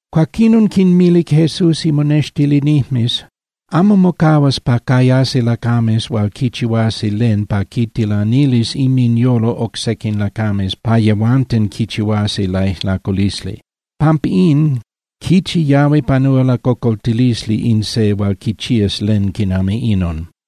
Cuaquinon quinmilic Jesús imonextilinijmes: —Amo mocahuas pa cayasi lacames hual quichihuasi len pa quitilanilis inminyolo oc sequin lacames pa yehuanten quichihuasi laijlaculisli. Pampín, ¡quichi yahui panúa lacocoltilisli in se hual quichías len quinami inon!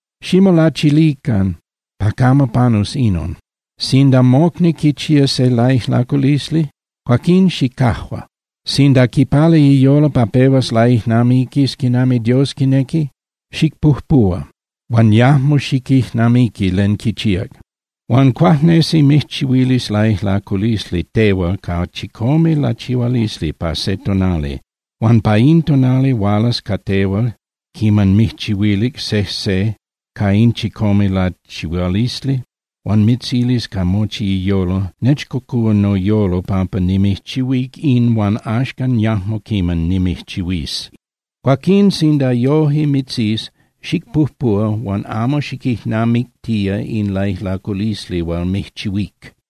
Ximolachilican pa camo panus inon. Sinda mocni quichía se laijlaculisli, cuaquín xicajua. Sinda quipala iyolo pa pehuas laijnamiquis quinami Dios quinequi, xicpujpuhua huan yajmo xiquijnamiqui len quichíac. Huan cuajnesi mijchihuilis laijlaculisli tehual ca chicome lachihualisli pa se tonali huan pa in tonali hualas ca tehual quiman mijchihuilic sejse ca in chicome lachihualisli, huan mitzilis ca mochi iyolo: “Nechcocúa noyolo pampa nimijchihuíc in huan axcan yajmo quiman nimijchihuís.” Cuaquín sinda yoje mitzís, xicpujpuhua huan amo xiquijnamictía in laijlaculisli hual mijchihuíc.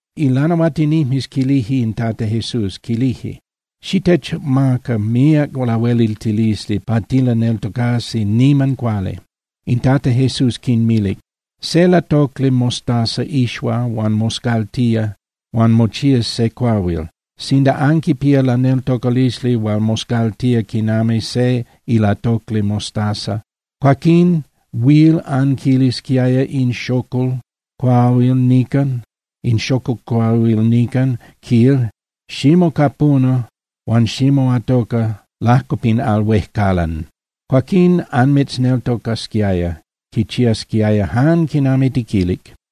Ilanahuatinijmes quilije in Tata Jesús, quilije: —Xitechmaca míac lahueliltilisli pa tilaneltocasi niman cuali. In Tata Jesús quinmilic: —Se ilatocli mostaza ixua huan moscaltía huan mochías se cuahuil. Sinda anquipía laneltocalisli hual moscaltía quinami se ilatocli mostaza, cuaquín huil anquilisquiaya in xocol cuahuil nican, quil: “Ximocapuna huan ximoatoca lajco pin al huejcalan.” Cuaquín anmitzneltocasquiaya, quichiasquiaya jan quinami tiquilic.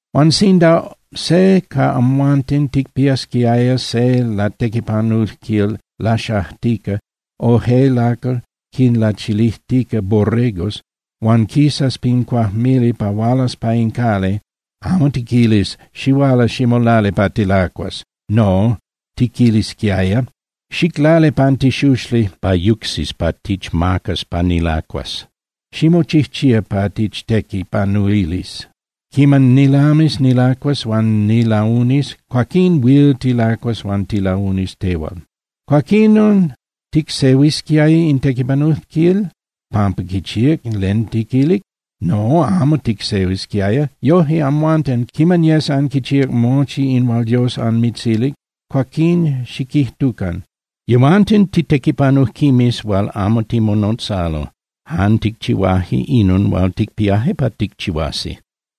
’Huan sinda se ca amhuanten ticpiasquiaya se latequipanujquil laxajtica o je lacal quinlachilijtica borregos, huan quisas pin cuajmili pa hualas pa in cali, amo tiquilis: “Xihuala ximolali pa tilacuas.” No, tiquilisquiaya: “Xiclali pan tixuxli pa yucsis pa tichmacas pa nilacuas, ximochijchía pa tichtequipanuilis. Quiman nilamis nilacuas huan nilaunis, cuaquín huil tilacuas huan tilaunis tehual.” Cuaquinon, ¿ticsehuisquiaya in tequipanujquil pampa quichíac len tiquilic? No, amo ticsehuisquiaya. Yoje amhuanten, quiman yes anquichíac mochi in hual Dios anmitzilic, cuaquín xiquijtucan: “Tehuanten titequipanujquimes hual amo timonotzalo, jan ticchihuaje inon hual ticpiaje pa ticchihuasi.”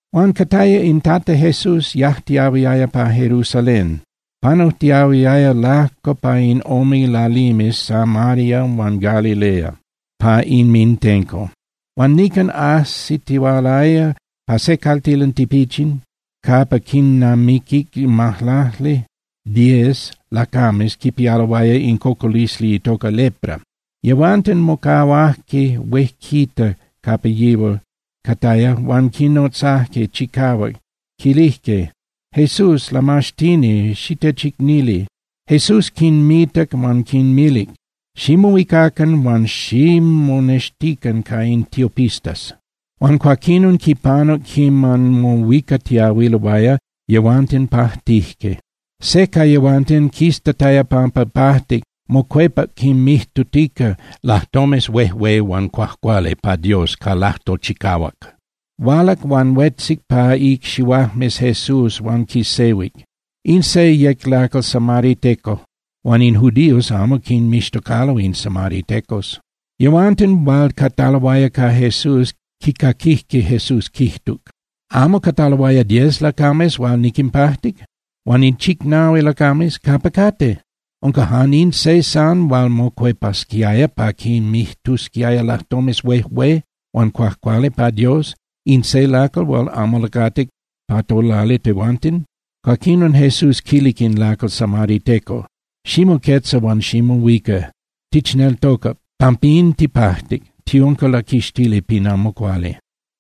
Huan cataya in Tata Jesús yajtiahuiaya pa Jerusalén, panujtiahuiaya lajco pa in ome lalimes Samaria huan Galilea pa inmintenco. Huan nican ajsitihualaya pa se caltilan tipichin capa quinnamiquic majlacli (diez) lacames quipialoaya in cocolisli itoca lepra. Yehuanten mocahuajque huejquita capa yihual cataya huan quinotzajque chicahuac, quilijque: —¡Jesús, Lamaxtini, xitechicnili! Jesús quinmitac huan quinmilic: —Ximohuicacan huan ximonextican ca in tiopistas. Huan cuaquinon quinpanuc quiman mohuicatiyahuiloaya, yehuanten pajtijque. Se ca yehuanten quiztataya pampa pajtic, mocuepac quinmijtutica lajtomes huejué huan cuajcuali pa Dios ca lajtol chicahuac. Hualac huan huetzic pa icxihuajmes Jesús huan quisehuic. In se yec lacal samariteco huan in judíos amo quinmixtocalo in samaritecos. Yehuanten hual cataloaya ca Jesús quicaquijque Jesús quijtuc: —¿Amo cataloaya diez lacames hual niquinpajtic? Huan in chicnahui lacames, ¿capa cate? ¿Unca jan in se san hual mocuepasquiaya pa quinmijtusquiaya lajtomes huejué huan cuajcuali pa Dios, in se lacal hual amo lacatic pa tolali tehuanten? Cuaquinon Jesús quilic in lacal samariteco: —Ximoquetza huan ximohuica. Tichneltocac, pampín tipajtic, tiunca laquixtili pin amo cuali.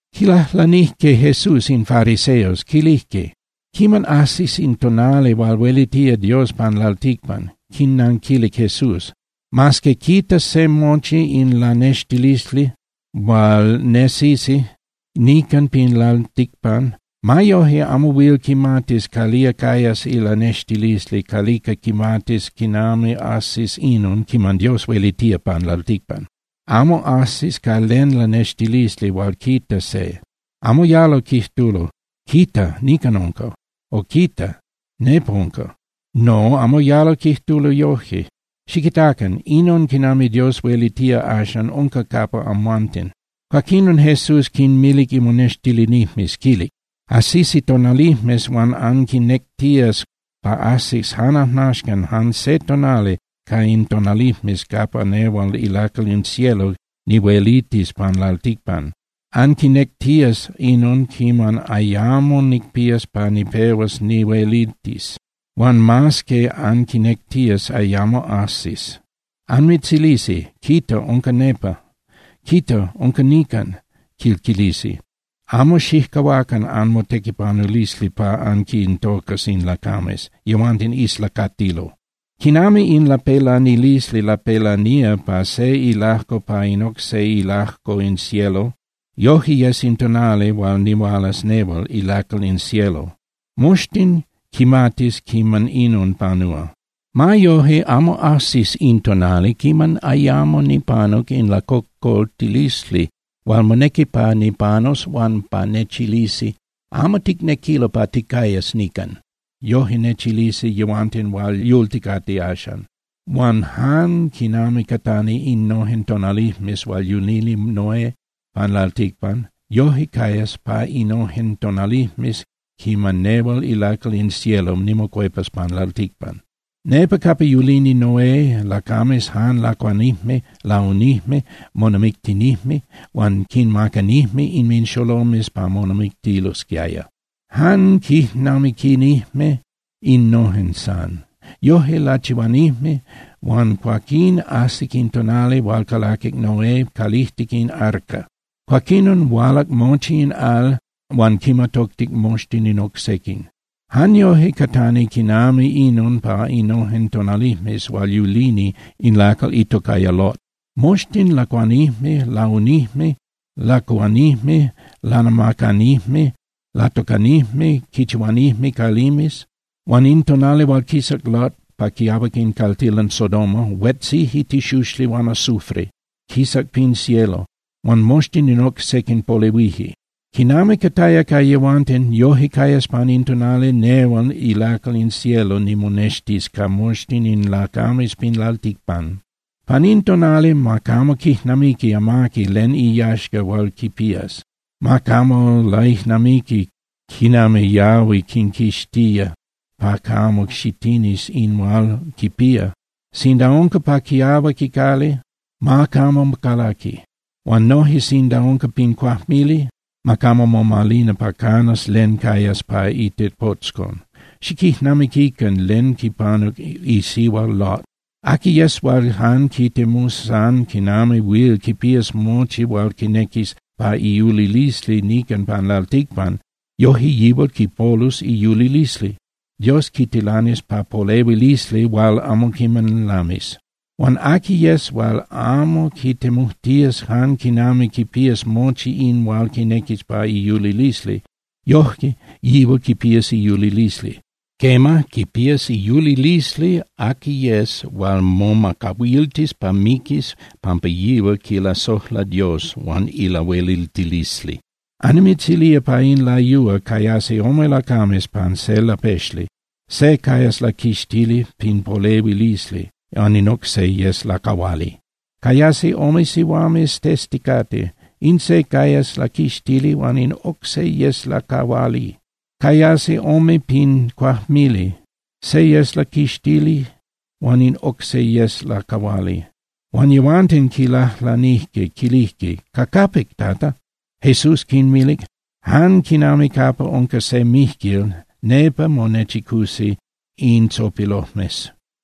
Quilajlanijque Jesús in fariseos, quilijque: —¿Quiman ajsis in tonali hual huelitía Dios pan lalticpan? Quinnanquilic Jesús: —Mas que quitas se mochi in lanextilisli hual nesisi nican pin lalticpan, ma yoje amo huil quimatis calía cayas ilanextilisli calica quimatis quinami ajsis inon quiman Dios huelitía pan lalticpan. Amo ajsis ca len lanextilisli hual quita se. Amo yalo quijtulo: “¡Quita, nican unca!”, o “¡Quita, nepa unca!” No, amo yalo quijtulo yoje. Xiquitacan. Inon quinami Dios huelitía axan unca capa amhuanten. Cuaquinon Jesús quinmilic imonextilinijmes, quilic: —Ajsisi tonalijmes huan anquinectías pa ajsis jan ajnaxcan jan se tonali ca in tonalijmes capa nehual ilacal in cielo nihuelitis pan lalticpan. Anquinectías inon quiman ayamo nicpías pa nipehuas nihuelitis. Huan mas que anquinectías, ayamo ajsis. Anmitzilisi: “¡Quita, unca nepa! ¡Quita, unca nican!”, quil quilisi. Amo xijcahuacan anmotequipanulisli pa anquintocas in lacames, yehuanten islacatilo. Quinami in lapelanilisli lapelanía pa se ilajco pa in oc se ilajco in cielo, yoje yes in tonali hual nihualas nehual ilacal in cielo. Moxtin quimatis quiman inon panúa. Ma yoje, amo ajsis in tonali quiman ayamo nipanuc in lacocoltilisli hual monequi pa nipanus huan pa nechilisi: “Amo ticnequilo pa ticayas nican.” Yoje nechilisi yehuanten hual yulticate axan. Huan jan quinami catani innojen tonalijmes hual yulini Noé pan lalticpan, yoje cayas pa innojen tonalijmes quiman nehual ilacal in cielo nimocuepas pan lalticpan. Nepa capa yulini Noé, lacames jan lacuanijme, launijme, monamictinijme huan quinmacanijme inminxolomes pa monamictilosquiaya. Jan quijnamiquinijme innojen san. Yoje lachihuanijme, huan cuaquín ajsic in tonali hual calaquic Noé calijtic in arca. Cuaquinon hualac mochi in al huan quinmatoctic moxtin in oc sequin. Jan yoje catani quinami inon pa innojen tonalijmes hual yulini in lacal itocaya Lot. Moxtin lacuanijme, launijme, lacuhuanijme, lanamacanijme, latocanijme, quinchihuanijme calimes. Huan in tonali hual quisac Lot pa quiahuac in caltilan Sodoma, huetzije tixuxli huan azufre, quisac pin cielo, huan moxtin in oc sequin polehuije. Quinami cataya ca yehuanten, yoje cayas pan in tonali nehual ilacal in cielo nimonextis ca moxtin in lacames pin lalticpan. Pan in tonali, ma camo quijnamiqui amaqui len iyaxca hual quipías, ma camo laijnamiqui quinami yahui quinquixtía pa camo xitinis in hual quipía. Sinda unca pa quiahuac icali, ma camo calaqui. Huan noje sinda unca pin cuajmili, ma camo momalina pa canas len cayas pa itepotzcon. Xiquijnamiquican len quipanuc isihua Lot. Aqui yes hual jan quitemus san quinami huil quipías mochi hual quinequis pa iyulilisli nican pan lalticpan, yoje yihual quipolus iyulilisli. Dios quitilanis pa polehuilisli hual amo quiman lamis. Huan aqui yes hual amo quitemujtías jan quinami quipías mochi in hual quinequis pa iyulilisli, yoje yihual quipías iyulilisli. Quema, quipías iyulilisli aqui yes hual momacahuiltis pa miquis pampa yihual quilasojla Dios huan ilahueliltilisli. Annimitzilía pa in layúa, cayasi ome lacames pan se lapexli. Se cayas laquixtili pin polehuilisli, huan in oc se yes lacahuali. Cayasi ome sihuames testicate, in se cayas laquixtili huan in oc se yes lacahuali. Cayasi ome pin cuajmili. Se yes laquixtili huan in oc se yes lacahuali. Huan yehuanten quilajlanijque, quilijque: —¿Ca capic, Tata? Jesús quinmilic: —Jan quinami capa unca se mijquil, nepa monechicusi in tzopilojmes.